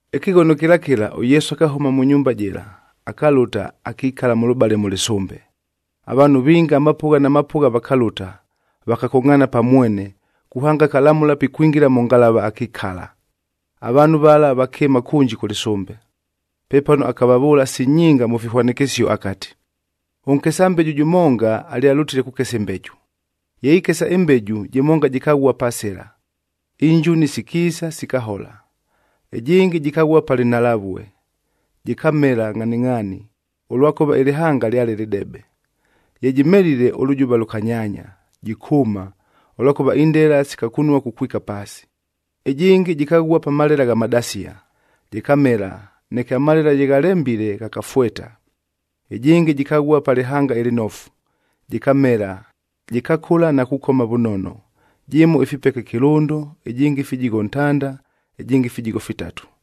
Ɨkɨghono kɨla kɨla, ʉYesu akahʉma mʉ nyumba jɨla, akalʉta, akikala mʉlʉbale mʉ lɨsʉmbe. Avaanhu vinga amapʉgha na mapʉgha vakalʉta, vakakongʼhaana pa mwene, kuhanga akalamʉla pikwingila mʉ ngalava akikala. Avaanhu vala vakɨɨma kʉnji kʉ lɨsʉmbe. Pepano akavavʉʉla si nyinga mʉ fihwanɨkɨsio akati, “Ʉnkesa mbeju jʉmonga alyalʉtile kukesa ɨmbeju. Ye ikesa, ɨmbeju jɨmonga jɨkaghua pa sɨla, injuni sikiisa, sikahola. Ɨjɨngɨ jɨkaghua pa lɨnhalavue, jɨkamela ngʼhaningʼhaani, ʉlwakʉva ɨlɨhanga lyale lɨdebe. Ye jɨmelile ʉlʉjʉva lʉkanyaanya, jɨkʉʉma, ʉlwakʉva indela sikakunua kukwika paasi. Ɨjɨngɨ jɨkaghua pa malela gha madasia, jɨkamela, neke amalela ye ghalembile ghakafweta. Ɨjɨngɨ jɨkaghua pa lɨhanga ɨlɨnofu, jɨkamela, jɨkakʉla na kukoma vʉnono, jɨmo ifipeke kɨlʉndo, ɨjɨngɨ fijigho ntanda, ɨjɨngɨ fijigho fitatu.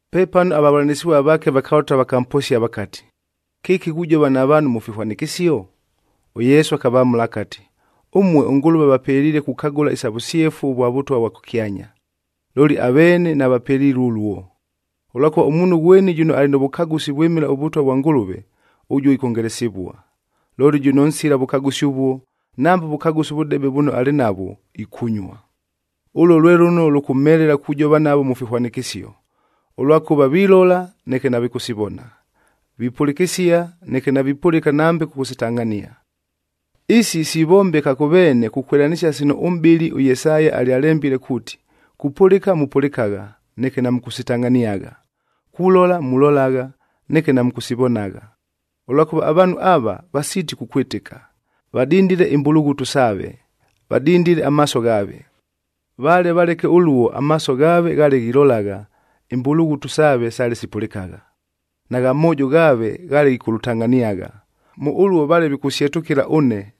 Pepano avavʉlanɨsɨvua vaake vakalʉta vakamposia vakati, “Kɨki ghujova na vaanhu mʉ fihwanɨkɨsio?” ɄYesu akavamʉla akati, “Ʉmue ʉNgʉlʉve avapeliile kukagʉla isa vʉsyefu ʉvwa Vʉtwa vwa kʉkyanya, looli aveene navapelilue ʉluo. Ʉlwakʉva ʉmuunhu ghweni jʉno alɨ nʉ vʉkagʉsi vwɨmɨla ʉVʉtwa vwa Ngʉlʉve, ʉjuo ikwongelesivua. Looli jʉno nsila vʉkagʉsi ʉvuo, nambe ʉvʉkagʉsi ʉvʉdebe vʉno alɨ navwo, Ʉluo lwe lʉno lʉkʉmhelela kujova navo mʉ fihwanɨkɨsio, ʉlwakʉva vilola, neke navikʉsivona; vipʉlɨkɨsia, neke navipʉlɨka nambe kʉkʉsitangʼhania. Isi sivombeka kʉ veene kukwɨlanɨsia sino ʉmʼbɨli ʉYesaya alyalembile kuuti, ‘Kupʉlɨka mupʉlɨkagha, neke namʉkʉsitangʼhaniagha. Kulola mulolagha, neke namʉkʉsivonagha. Ʉlwakʉva avaanhu ava, vasiiti kukwɨtɨka. Vadindile imbulughutu saave, vadindile amaaso ghaave. Vale valeke ʉluo, amaaso ghaave ghaale ghilolagha, imbulughutu saave sale sipʉlɨkagha, nagha moojo ghaave ghaale ghikʉlʉtangʼhaniagha. Mʉ ʉluo vale vikʉsyetʉkɨla ʉne,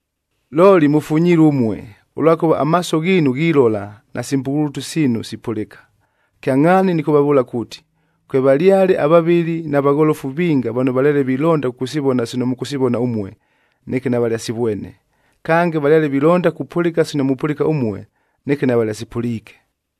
“Looli mʉfunyilue ʉmue, ʉlwakʉva amaaso ghiinu ghilola nasi mbulughutu siinu sipʉlɨka. Kyangʼhaani nɨkʉvavʉʉla kuuti, kwevalyale avavɨli na vagholofu vinga vano valyale vilonda kʉkʉsivona sino mʉkʉsivona ʉmue, neke navalyasivwene. Kange, valyale vilonda kupʉlɨka sino mupʉlɨka ʉmue, neke navalyasipʉliike.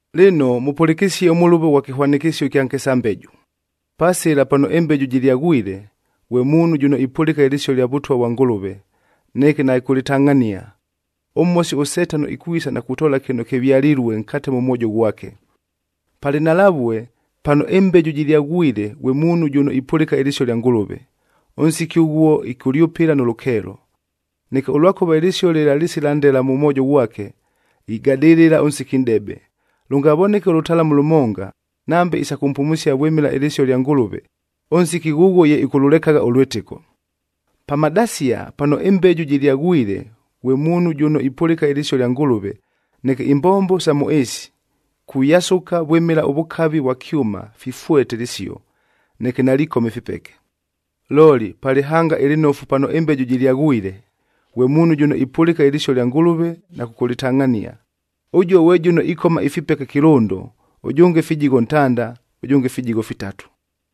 “Lɨno, mʉpʉlɨkɨsie ʉmʉlʉvo ghwa kɨhwanɨkɨsio ɨkya nkesa mbeju. Pa sɨla pano ɨmbeju jɨlyaghwile, ghwe muunhu jʉno ipʉlɨka ɨlɨsio lya Vʉtwa vwa Ngʉlʉve, neke naɨkʉlɨtangʼhania, ʉMhosi ʉSetano ikwisa na kutoola kɨno kɨvyalilue nkate mʉ mwojo ghwake. Pa lɨnhalavue, pano ɨmbeju jɨlyaghwile ghwe muunhu jʉno ipʉlɨka ɨlɨsio lya Ngʉlʉve, ʉnsiki ʉghuo ɨkʉlyʉpɨla nʉ lʉkeelo. Neke ʉlwakʉva ɨlɨsio lɨla lɨsila ndela mʉ mwojo ghwake, igadɨlɨla ʉnsiki nʼdebe, lʉngavoneke ʉlʉtalamu lʉmonga, nambe isa kʉmpumusia vwɨmɨla ɨlɨsio lya Ngʉlʉve, ʉnsiki ghʉghuo ye ɨkʉlʉlekagha ʉlwɨtɨko. Pa madasia, pano ɨmbeju jɨlyaghwile ghwe muunhu jʉno ipʉlɨka ɨlɨsio lya Ngʉlʉve, neke imbombo sa mʉ ɨɨsi, kuyasʉka vwɨmɨla ʉvʉkavi vwa kyʉma fifweta ɨlɨsio, neke nalikoma ifipeke. Looli pa lɨhanga ɨlɨnofu pano ɨmbeju jɨlyaghwile, ghwe muunhu jʉno ipʉlɨka ɨlɨsio lya Ngʉlʉve na kʉkʉlɨtangʼhania. Ʉjuo ghwe jʉno ikoma ifipeke kɨlʉndo, ʉjʉnge fijigho ntanda, ʉjʉnge fijigho fitatu.”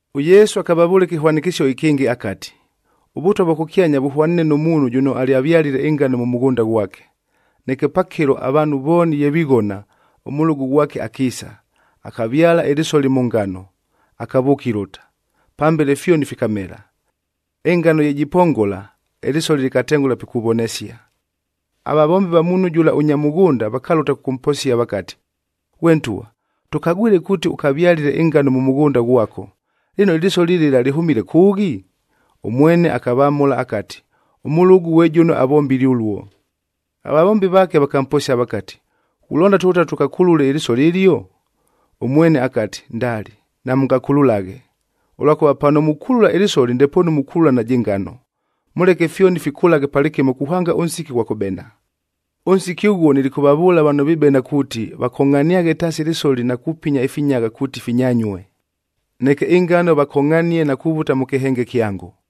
ɄYesu akavavʉʉla ɨkɨhwanɨkɨsio ɨkɨngɨ akati, “ɄVʉtwa vwa kʉkyanya vʉhwaniine nʉ muunhu jʉno alyavyalile ɨngano mʉ mʉghʉnda ghwake. Neke pakɨlo avaanhu vooni ye vighona, ʉmʉlʉgʉ ghwake akiisa, akavyala ɨlɨsoli mʉ ngano, akavʉʉka ilʉta. Pambele fyoni fikamela. Ɨngano ye jipongola, ɨlɨsoli lɨkatengʉla pikuvonesia. “Avavombi va muunhu jʉla ʉnya mʉghʉnda vakalʉta kʉkʉmposia vakati, ‘Ghwe ntwa, tʉkagwile kuuti ʉkavyalile ɨngano mʉ mʉghʉnda ghwako, lɨno ɨlɨsoli lɨla lɨhʉmile kʉʉghi?’ Ʉmwene akavamʉla akati, ‘Ʉmʉlʉgʉ ghwe jʉno avombile ʉluo.’ Avavombi vaake vakamposia vakati, ‘Ghulonda tʉlʉte tʉkakulule ɨlɨsoli ɨlio?’ Ʉmwene akati, ‘Ndali, namʉngakululaghe, ʉlwakʉva pano mukulula ɨlɨsoli ndepoonu mukulula najɨ ngano. Mʉleke fyoni fikʉlaghe palɨkɨmo kuhanga ʉnsiki ghwa kʉbena. Ʉnsiki ʉghuo, nilikʉvavʉʉla vano vibena kuuti, vakongʼhaniaghe taasi ɨlɨsoli na kupinya ifinyagha kuuti finyanyue. Neke ɨngano vakongʼhanie na kuvuta mʉ kɨhenge kyango.’”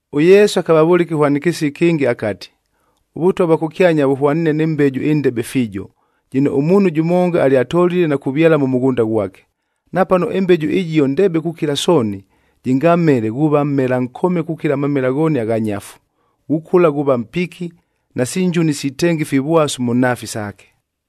ɄYesu akavavʉʉla ɨkɨhwanɨkɨsio ɨkɨngɨ akati, “ɄVʉtwa vwa kʉkyanya vʉhwaniine nɨ mbeju ɨndebe fiijo,c jɨno ʉmuunhu jʉmonga alyatolile na kuvyala mʉ mʉghʉnda ghwake. Napano ɨmbeju ɨjio ndebe kukila sooni, jɨngamele, ghuuva mmela nkome kukila amamela ghooni agha nyafu. Ghukʉla ghuuva mpiki, nasi njuni sitenga ifivwasu mʉ nhaafi saake.”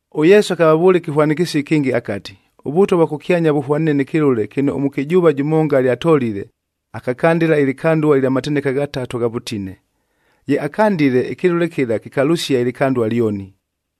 ɄYesu akavavʉʉla ɨkɨhwanɨkɨsio ɨkɨngɨ akati, “ɄVʉtwa vwa kʉkyanya vʉhwaniine nɨ kɨlʉle kɨno ʉmʉkɨjʉʉva jʉmonga alyatolile, akakandɨla ɨlɨkandua ɨlya mateneka ghatatu agha vʉtine. Ye akandile, ɨkɨlʉle kɨla kɨkalʉsia ɨlɨkandua lyoni.”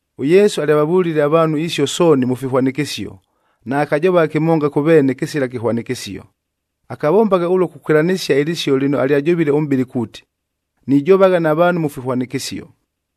ɄYesu alyavavʉlile avaanhu isio sooni mʉ fihwanɨkɨsio. Naakajovagha kɨmonga kʉ veene kɨsila kɨhwanɨkɨsio. Akavombagha ʉluo kukwɨlanɨsia ɨlɨsio lɨno alyajovile ʉmʼbɨli kuuti, “Nijovagha na vaanhu mʉ fihwanɨkɨsio.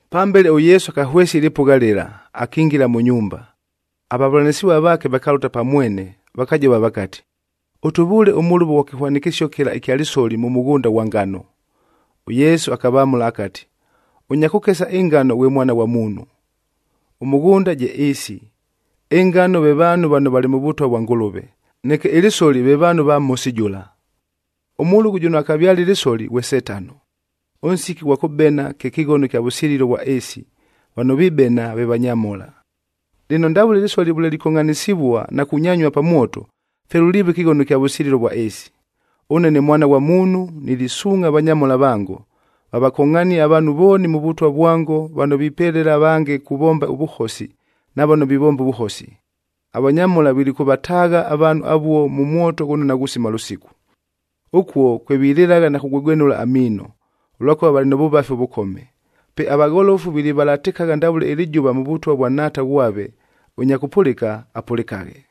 Pambele ʉYesu akahwesia ɨlɨpʉgha lɨla, akingila mʉ nyumba. Avavʉlanɨsɨvua vaake vakalʉta pa mwene, vakajova vakati, “Ʉtʉvʉʉle ʉmʉlʉvo ghwa kɨhwanɨkɨsio kɨla ɨkya lɨsoli mʉ mʉghʉnda ghwa ngano.” ɄYesu akavamʉla akati, “Ʉnya kʉkesa ɨngano ghwe Mwana ghwa Muunhu. Ʉmʉghʉnda je ɨɨsi, ɨngano ve vaanhu vano valɨ mʉ Vʉtwa vwa Ngʉlʉve, neke ɨlɨsoli ve vaanhu ava Mhosi jʉla. Ʉmʉlʉgʉ jʉno akavyalile ɨlɨsoli, ghwe Setano. Ʉnsiki ʉghwa kʉbena kye kɨghono kya vʉsililo vwa ɨɨsi, vano vibena ve vanyamhola. “Lɨno, ndavʉle ɨlɨsoli vʉle likongʼhanɨsɨvua na kunyanyua pa mwoto, fye luliiva ɨkɨghono ɨkya vʉsililo vwa ɨɨsi. Ʉne ne Mwana ghwa Muunhu nilisuungʼha avanyamhola vango, vavakongʼhanie avaanhu vooni mʉ Vʉtwa vwango vano vipelela avange kuvomba ʉvʉhosi na vano vivomba ʉvʉhosi. Avanyamhola vilikʉvataagha avaanhu avuo mʉ mwoto ghʉno naghusima lʉsiku. Ʉkuo kwe vililɨlagha na kugwegwenʉla amiino, ʉlwakʉva valɨ mʉ vʉvafi ʉvʉkome. Pe avagholofu vilivalatɨkagha ndavʉle ɨlɨjʉva mʉ Vʉtwa vwa Nhaata ghwave. Ʉnya kʉpʉlɨka, apʉlɨkaghe!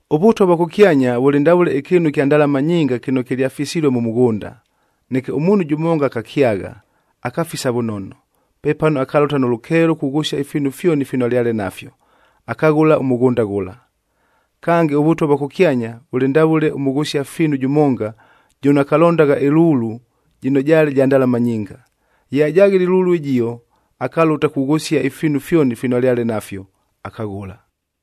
“ɄVʉtwa vwa kʉkyanya vʉlɨ ndavʉle ɨkɨɨnu ɨkya ndalama nyinga kɨno kɨlyafisilue mʉ mʉghʉnda. Neke ʉmuunhu jʉmonga akakyagha, akafisa vʉnono. Pepano akalʉta nʉ lʉkeelo kughʉsia ifiinu fyoni fino alyale nafyo, akaghʉla ʉmʉghʉnda ghʉla. “Kange, ʉVʉtwa vwa kʉkyanya vʉlɨ ndavʉle ʉmʉghʉsia fiinu jʉmonga jʉno akalondagha ɨlulue jɨno jaale ja ndalama nyinga. Ye ajaghile ɨlulu ɨjio, akalʉta kughʉsia ifiinu fyoni fino alyale nafyo, akaghʉla.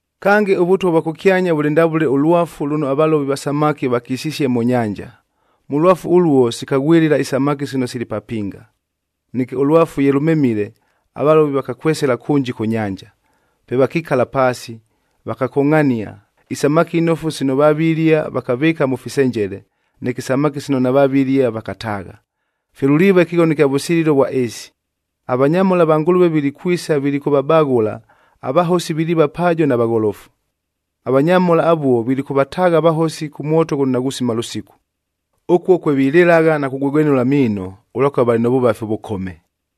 “Kange, ʉVʉtwa vwa kʉkyanya vʉlɨ ndavʉle ʉlwafu lʉno avalovi va samaki vakisisie mʉ nyanja. Mʉ lwafu ʉluo sikaghwɨlɨla isamaki sino sili papinga. Neke ʉlwafu ye lʉmemile, avalovi vakakwesela kʉnji kʉ nyanja. Pe vakikala paasi, vakakongʼhania, isamaki inofu sino vavilia, vakavɨɨka mʉ fisenjele, neke isamaki sino navavilia, vakataagha. Fye luliiva ɨkɨghono ɨkya vʉsililo vwa ɨɨsi. Avanyamhola va Ngʉlʉve vilikwisa, vilikʉvabaghʉla, avahosi viliiva paajo na vagholofu. Avanyamhola avuo vilikʉvataagha avahosi kʉ mwoto ghʉno naghusima lʉsiku. Ʉkuo kwe vililɨlagha na kugwegwenʉla amiino, ʉlwakʉva valɨ mʉ vʉvafi ʉvʉkome.”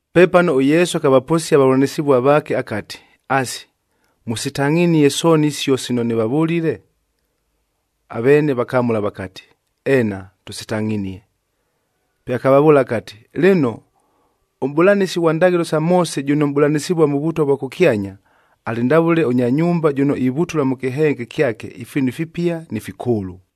Pepano ʉYesu akavaposia avavʉlanɨsɨvua vaake akati, “Asi, mʉsitangʼhinie sooni isio sino nɨvavʉlile?” Aveene vakamʉla vakati, “Eena, tʉsitangʼhinie.” Pe akavavʉʉla akati, “Lɨno, ʉmʼbʉlanɨsi ghwa ndaghɨlo sa Moose jʉno mʼbʉlanɨsɨvua mʉ Vʉtwa vwa kʉkyanya, alɨ ndavʉle ʉnya nyumba jʉno ivutula mʉ kɨhenge kyake ifiinu ifipia ni fikʉʉlʉ.”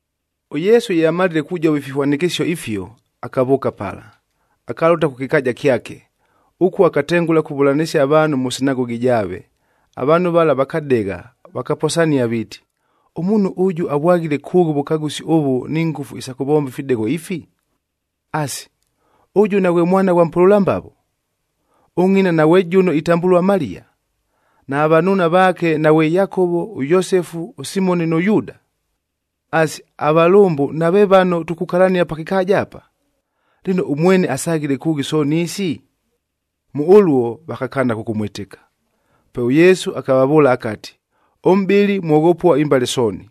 ɄYesu ye amalile kujova ifihwanɨkɨsio ifio, akavʉʉka pala, akalʉta kʉ kɨkaaja kyake. Ʉkuo akatengʉla kuvʉlanɨsia avaanhu mʉ sinagogi jaave. Avaanhu vala vakadegha, vakaposania viiti, “Ʉmuunhu ʉjʉ avwaghile kʉʉghi ʉvʉkagʉsi ʉvʉ ni ngʉfu isa kʉvomba ifidegho ifi? Asi, ʉjʉ naghwe mwana ghwa mpʉlʉla mbavo?f Ʉngʼina naghwe jʉno itambʉlua Maliya? Nava vanuuna vaake naghwe Yakovo, ʉYosefu, ʉSimoni nʉ Yuuda? Asi, avalʉmbʉ nave vano tukukalania pa kɨkaaja apa? Lɨno, ʉmwene asaghile kʉʉghi sooni isi?” Mʉ ʉluo vakakaana kʉkʉmwɨtɨka. Pe ʉYesu akavavʉʉla akati, “Ʉmʼbɨli mwoghopua imbale sooni,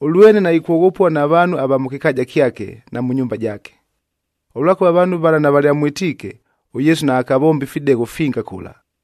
ʉlwene naikwoghopua na vaanhu ava mʉ kɨkaaja kyake na mʉ nyumba jaake.” Ʉlwakʉva avaanhu vala navalyamwɨtiike, ʉYesu naakavomba ifidegho finga kʉla.